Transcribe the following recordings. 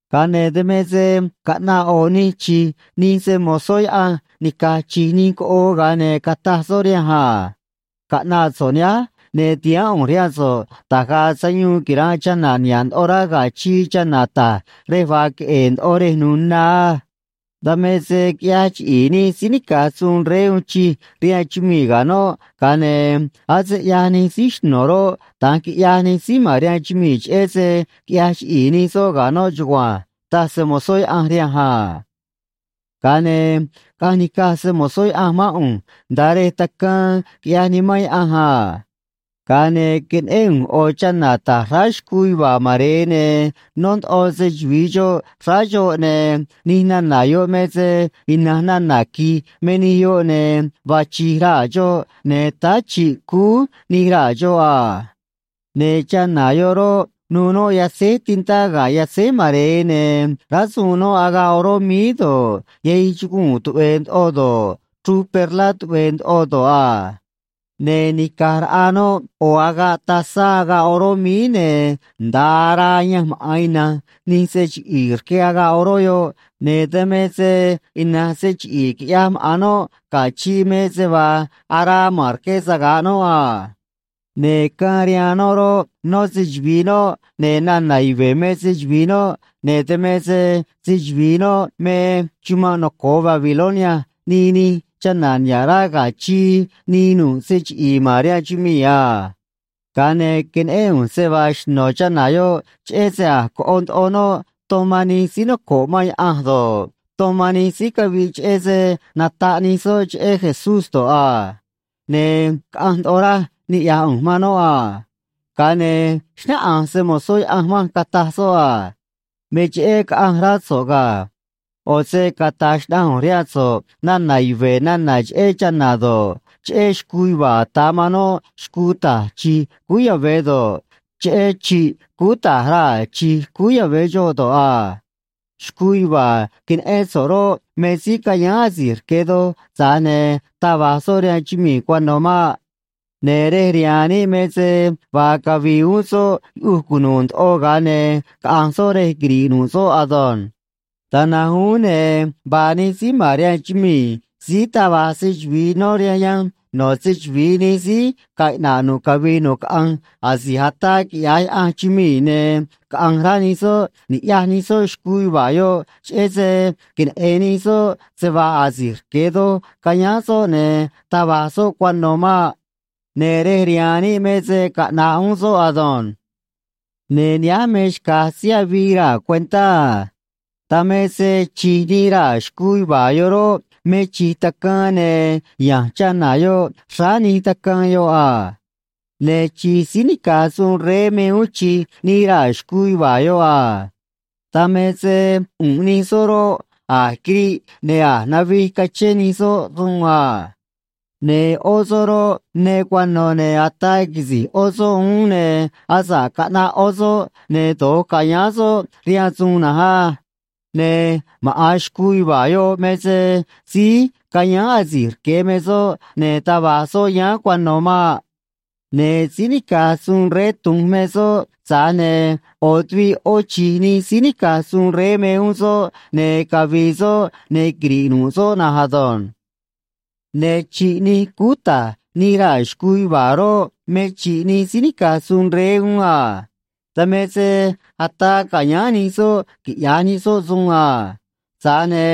Ga̱a ne̱ dan me se caꞌnaꞌ ꞌo̱ nij chi̱j nij se‑mo̱zó Yaꞌanj nica̱j chi̱j nij coꞌoo, ga̱a ne̱ cataj soꞌ rihanj a: ―Caꞌna̱ꞌ so̱ꞌ nihánj, ne̱ ti̱haán ꞌu̱nj rihaan so̱ꞌ da̱j ga̱a̱ sayuun quira̱nꞌ chana̱ niha̱ꞌ ndoꞌo rá ga̱ chii, chana̱ ta̱j rej vaa queꞌe̱e̱ ndoꞌo rej nu̱u̱ na á. Dan me se quiꞌyaj chiꞌi̱i̱ nij síí nica̱j suun rey uun chij rihaan chumii̱ ga̱ noꞌ, ga̱a ne̱ ase ꞌyaj nij síí xno̱ roꞌ, da̱nj quiꞌyaj nij síí ma̱n rihaan chumii̱, cheꞌé se quiꞌyaj chiꞌi̱i̱ nij soꞌ ga̱ noꞌ chugua̱nj ―taj se‑mo̱zó Yaꞌanj rihanj a. Ga̱a ne̱ caꞌanj nica̱j se‑mo̱zó Yaꞌanj mán ꞌu̱nj nda̱a rej tacaan, quiꞌyaj Nimán Yaꞌanj a. Ga̱a ne̱ queneꞌén ꞌu̱nj ꞌo̱ chana̱ ta̱j xráá xcuu yuva̱a̱ mare̱e, ne̱ nó ndoꞌo se‑chuvi̱i xoꞌ xráá xoꞌ, ne̱ nij nana̱ yoꞌ me se ina̱nj nana̱ qui̱j me nij yoꞌ, ne̱ vaa chi̱j raa̱ xoꞌ, ne̱ táá chi̱ꞌ cúú nij raa̱ xoꞌ a. Ne̱ chana̱ yoꞌ roꞌ, nuû noꞌ yatzéj tintá ga̱ yatzéj mare̱e, ne̱ rásuun noꞌ agaꞌ oró míí do̱ꞌ, yahij chuguu̱n tuꞌve̱e̱ ndoꞌo do̱ꞌ, chruj perlá tuꞌve̱e̱ ndoꞌo do̱ꞌ a. Ne̱ nica̱j raꞌa noꞌ ꞌo̱ agaꞌ tazá agaꞌ oró míí, ne̱ nda̱a araa ayanj maꞌa̱n ina̱nj nij se chiꞌi̱i̱ rque agaꞌ oró yoꞌ, ne̱ dan me se ina̱nj se chiꞌi̱i̱ quiꞌyaj maꞌa̱n noꞌ ga̱ chii me se vaa araa ma̱n rque saga̱ꞌ noꞌ a. Ne̱ caan rihaan noꞌ roꞌ, nó se‑chuvi̱i noꞌ, ne̱ nana̱ yuve̱ me se‑chuvi̱i noꞌ, ne̱ dan me se se-chuvi̱i noꞌ me: “Chumanꞌ noco̱o Babilonia, nii nij chana̱ niha̱ꞌ rá ga̱ chii, nii nu̱ꞌ se chiꞌi̱i̱ ma̱n rihaan chumii̱ a.” Ga̱a ne̱ queneꞌén ꞌu̱nj se vaa xno̱ chana̱ yoꞌ, cheꞌé se a̱j coꞌo ndoꞌo noꞌ ton man nij síí noco̱ꞌ man Yaꞌanj do̱ꞌ, ton man nij síí caviꞌ cheꞌé se nataꞌ nij soꞌ cheꞌé Jesús do̱ꞌ a. Ne̱ caꞌanj ndoꞌo raj niꞌya̱j ꞌu̱nj man noꞌ a. Ga̱a ne̱ xnáꞌanj se‑mo̱zó Yaꞌanj manj, cataj soꞌ a: ―Me cheꞌé caꞌanj rá so̱ꞌ ga̱. ꞌO̱ se cata̱j xnaꞌanj ꞌu̱nj rihaan so̱ꞌ nana̱ yuve̱ nana̱ cheꞌé chana̱ do̱ꞌ, cheꞌé xcuu yuva̱a̱ ata̱ man noꞌ xcuu ta̱j chi̱j cúú yave̱ do̱ꞌ, cheꞌé chi̱ꞌ cúú ta̱j raa̱ chi̱j cúú yave̱ xoꞌ do̱ꞌ a. Xcuu yuva̱a̱ queneꞌén so̱ꞌ roꞌ, me síí cayáán asi̱j rque̱ doj, tza̱j ne̱ taj va̱j soꞌ rihaan chumii̱ cuano̱ maꞌ. Ne̱ rej rihaan níꞌ me se vaa cavi̱i̱ uún soꞌ yuꞌuj cunu̱u̱ ndoꞌo, ga̱a ne̱ caꞌa̱nj soꞌ rej quiri̱ꞌ nu̱ꞌ soꞌ ado̱nj. Da̱nj na̱nj uún, ne̱ vaa nij síí ma̱n rihaan chumii̱ síí taj vaj se‑chuvi̱i nó rihaan yanj no̱ se‑chuvi̱i nij síí ga̱a̱ iꞌna̱ꞌ nu̱ꞌ cavii nu̱ꞌ caꞌanj asi̱j ataa quiꞌya̱j Yaꞌanj chumii̱, ne̱ caꞌa̱nj rá nij soꞌ ni̱ꞌyaj nij soꞌ xcuu yuva̱a̱ yoꞌ, cheꞌé se queneꞌe̱n nij soꞌ se vaa asi̱j rque̱ doj cayáán soꞌ, ne̱ taj va̱j soꞌ cuano̱ maꞌ. Ne̱ rej rihaan níꞌ me se caꞌna̱ꞌ uún soꞌ ado̱nj. ’Ne̱ nihánj me xca̱j síí avii raa̱ cuentá a. Dan me se chi̱j nij raa̱ xcuu yuva̱a̱ yoꞌ roꞌ, me chi̱j tacaan, ne̱ ya̱nj chana̱ yoꞌ xráá nij tacaan yoꞌ a. Ne̱ chi̱j síí nica̱j suun rey me uún chi̱j nij raa̱ xcuu yuva̱a̱ yoꞌ a. Dan me se ꞌu̱nꞌ nij soꞌ roꞌ, a̱j quiriꞌ ne̱ a̱j navij cachén nij soꞌ suun a. Ne̱ ꞌó soꞌ roꞌ, ne cuano̱, ne̱ ataa quisi̱j ꞌó soꞌ uún, ne̱ asa̱ꞌ caꞌnaꞌ ꞌó soꞌ, ne̱ do̱j ca̱yáán soꞌ rihaan suun na̱nj á. Ne̱ maꞌa̱n xcuu yuva̱a̱ yoꞌ me se síí cayáán asi̱j rque̱ me soꞌ, ne̱ taj va̱j soꞌ yáán cuano̱ maꞌ. Ne̱ síí nica̱j suun rey tu̱nj me soꞌ, tza̱j ne̱ ꞌo̱ tuviꞌ ꞌó chi̱j nij síí nica̱j suun rey me uún soꞌ, ne̱ cavi̱i̱ soꞌ, ne̱ quiri̱ꞌ nu̱ꞌ soꞌ na̱nj ado̱nj. ’Ne̱ chi̱ꞌ nij cúú ta̱j nij raa̱ xcuu yuva̱a̱ roꞌ, me chi̱ꞌ nij síí nica̱j suun rey uún a. Dan me se ataa ca̱yáán nij soꞌ quiꞌya̱j nij soꞌ suun a. Tza̱j ne̱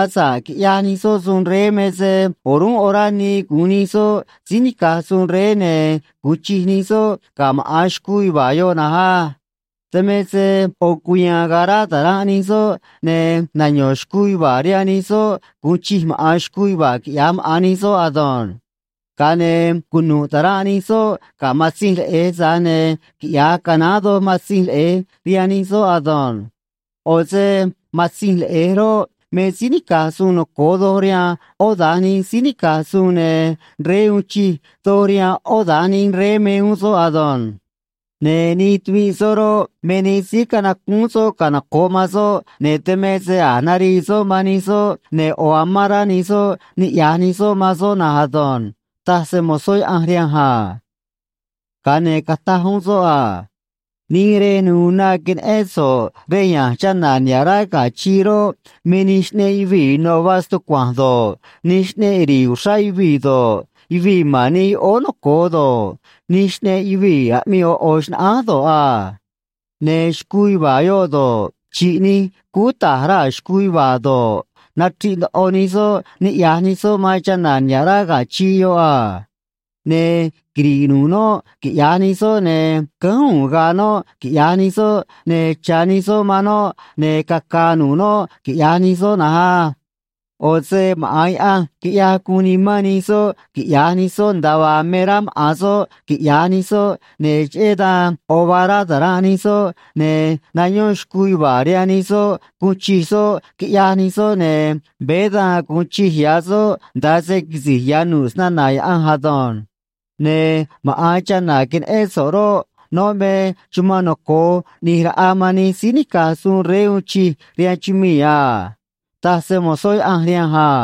asa̱ꞌ quiꞌyaj nij soꞌ suun rey me se o̱rúnꞌ orá nii gu̱un nij soꞌ síí nica̱j suun rey ne̱ gu̱un chij nij soꞌ ga̱ maꞌa̱n xcuu yuva̱a̱ yoꞌ na̱nj á. Dan me se ꞌo̱ cuya̱a̱n ga̱a̱ rá ta̱ranꞌ nij soꞌ, ne̱ nayo̱n xcuu yuva̱a̱ rihaan nij soꞌ gu̱un chij maꞌa̱n xcuu yuva̱a̱, quiꞌya̱j maꞌa̱n nij soꞌ ado̱nj. Ga̱a ne̱ cunu̱ꞌ ta̱ranꞌ nij soꞌ ga̱ Matzinj Leꞌe̱j, tza̱j ne̱ quiꞌya̱j canaán doj Matzinj Leꞌe̱j rihaan nij soꞌ ado̱nj. ꞌO̱ se Matzinj Leꞌe̱j roꞌ, me síí nica̱j suun noco̱o doj rihaan ꞌó da̱nj nij síí nica̱j suun, ne̱ rey uun chij doj rihaan ꞌó da̱nj nij rey me uún soꞌ ado̱nj. Ne̱ nij tuviꞌ soꞌ roꞌ, me nij síí canacúún soꞌ canoco̱ꞌ man soꞌ, ne̱ dan me se a̱j narii soꞌ man nij soꞌ, ne̱ ꞌo̱ amán rá nij soꞌ niꞌya̱j nij soꞌ man soꞌ na̱nj ado̱nj ―taj se‑mo̱zó Yaꞌanj rihanj a. Ga̱a ne̱ cataj uún soꞌ a: ―Nij rej nu̱u̱ na queneꞌén so̱ꞌ rej ya̱nj chana̱ niha̱ꞌ rá ga̱ chii roꞌ, me nij xꞌneꞌ yuvii̱ ino̱ vaa stucua̱nj do̱ꞌ, nij xꞌneꞌ ri̱i̱ uxrá yuvii̱ do̱ꞌ, yuvii̱ ma̱n nij yoꞌóó noco̱o do̱ꞌ, nij xꞌneꞌ yuvii̱ aꞌmii ꞌo̱ ꞌo̱ xnaꞌánj do̱ꞌ a. Ne̱ xcuu yuva̱a̱ yoꞌ do̱ꞌ, chi̱ꞌ nij cúú ta̱j raa̱ xcuu yuva̱a̱ do̱ꞌ, nachri̱ꞌ ndoꞌo nij soꞌ ni̱ꞌyaj nij soꞌ man chana̱ niha̱ꞌ rá ga̱ chii yoꞌ a. Ne̱ quiri̱ꞌ nu̱ꞌ noꞌ, quiꞌya̱j nij soꞌ, ne̱ cánj u̱u̱n ga̱a̱ noꞌ, quiꞌya̱j nij soꞌ, ne̱ cha̱ nij soꞌ man noꞌ, ne̱ caca̱a̱ nu̱ꞌ noꞌ, quiꞌya̱j nij soꞌ na̱nj á. ꞌO̱ se maꞌa̱n Yaꞌanj quiꞌyaj guun nimán nij soꞌ quiꞌya̱j nij soꞌ nda̱a vaa me rá maꞌa̱n soꞌ quiꞌya̱j nij soꞌ, ne̱ cheꞌé dan ꞌo̱ vaa rá ta̱ranꞌ nij soꞌ, ne̱ nayón xcuu yuva̱a̱ rihaan nij soꞌ guun chij soꞌ, quiꞌyaj nij soꞌ, ne̱ veé da̱nj gu̱un chij ya̱ soꞌ nda̱a se quisi̱j ya̱ nu̱ꞌ snana̱ Yaꞌanj ado̱nj. Ne̱ maꞌa̱n chana̱ queneꞌén so̱ꞌ roꞌ, noꞌ me chumanꞌ noco̱o ꞌni̱j raꞌa man nij síí nica̱j suun rey uun chij rihaan chumii̱ a ―taj se‑mo̱zó Yaꞌanj rihanj a.